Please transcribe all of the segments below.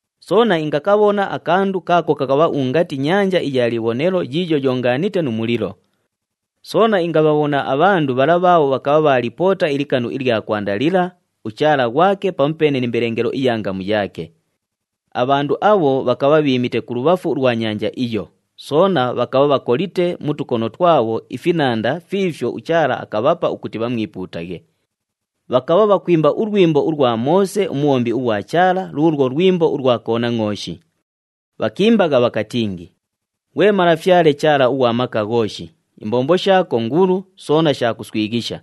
Soona ingakabhona akandu kaako kakabha ungati nyanja iya libhonelo yiiyo yoongaanite nu mulilo. Soona ingabhabhona abhandu bhala bhaabho bhakabha bhaalipoota ilikanu ilya kwanda lila, uchaala ghwake pamupeene ni mbelengelo iya ngamu yaake. Abhandu abho bhakabha bhiimite kulubhafu ulwa nyanja iyo, soona bhakabha bhakolite mu tukono twabho ifinanda fiifyo uChaala akabhapa ukuti bhamwipuutaghe. Bhakabha bhakwimba ulwimbo ulwa Moose umubhombi ughwa Chaala, luulwo lwimbo ulwa Konangʼooshi. Bhakiimbagha bhakatingi, “Ghwe Malafyale Chaala ughwa Maka Ghooshi, imbombo shaako ngulu, soona sha kuswighisha.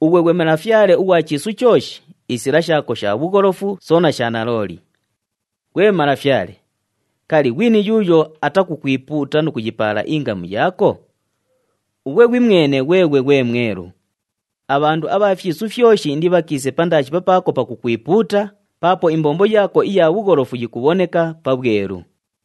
Ughwe ghwe Malafyale ughwa chiisu chooshi, isila shaako sha bhugholofu, soona sha nalooli. Ghwe Malafyale, kali, ghwini yuuyo atakukwipuuta nu kuyipaala ingamu yaako? Ughwe ghwimwene ghweghwe ghwe Mwelu. Abhandu abha fyisu fyoshi indibhakiise pandaashi papaako pakukwipuuta, paapo imbombo yaako iya bhugholofu yikubhoneka pabhwelu.”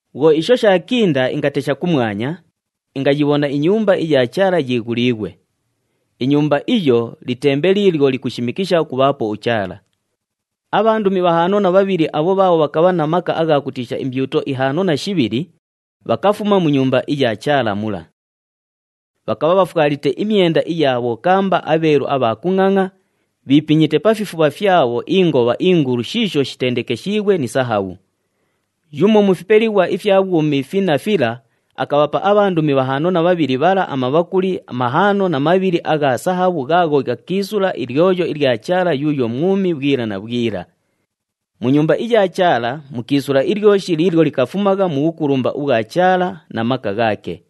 Bhwo isho shaakinda, ingatesha kumwanya, ingayibhona iNyumba iya Chaala yiighuliighwe. INyumba iyo, litembe liilyo likushimikisha ukubhaapo uChaala. Abhandumi bhahaano na bhabhili abho bhaabho bhakabha na maka agha kutiisha imbyuto ihaano na shibhili, bhakafuma mu Nyumba iya Chaala mula. Bhakabha bhafwalite imyenda iya bhokamba abheelu abha kungʼangʼa, bhiipinyite pa fifubha fyabho ingobha ingulu shiisho shitendekeshiighwe ni sahabhu. Yumo mu fipelighwa ifya bhwumi finna fila, akabhapa abhandumi bhahaano na bhabhili bhala amabhakuli mahaano na mabhili agha sahabhu ghaagho ghakiisula ilyoyo ilya Chaala yuuyo mwumi bhwila na bhwila. Mu Nyumba iya Chaala mukiisula ilyoshi liilyo likafumagha mu bhukulumba ubhwa Chaala na maka ghaake.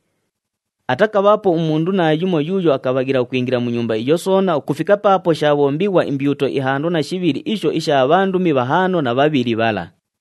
Atakabhaapo umundu naayumo yuuyo akabhaghila ukwingila mu Nyumba iyo soona ukufika paapo shaabhombighwa imbyuto ihaano na shibhili isho isha bhandumi bhahaano na bhabhili bhala.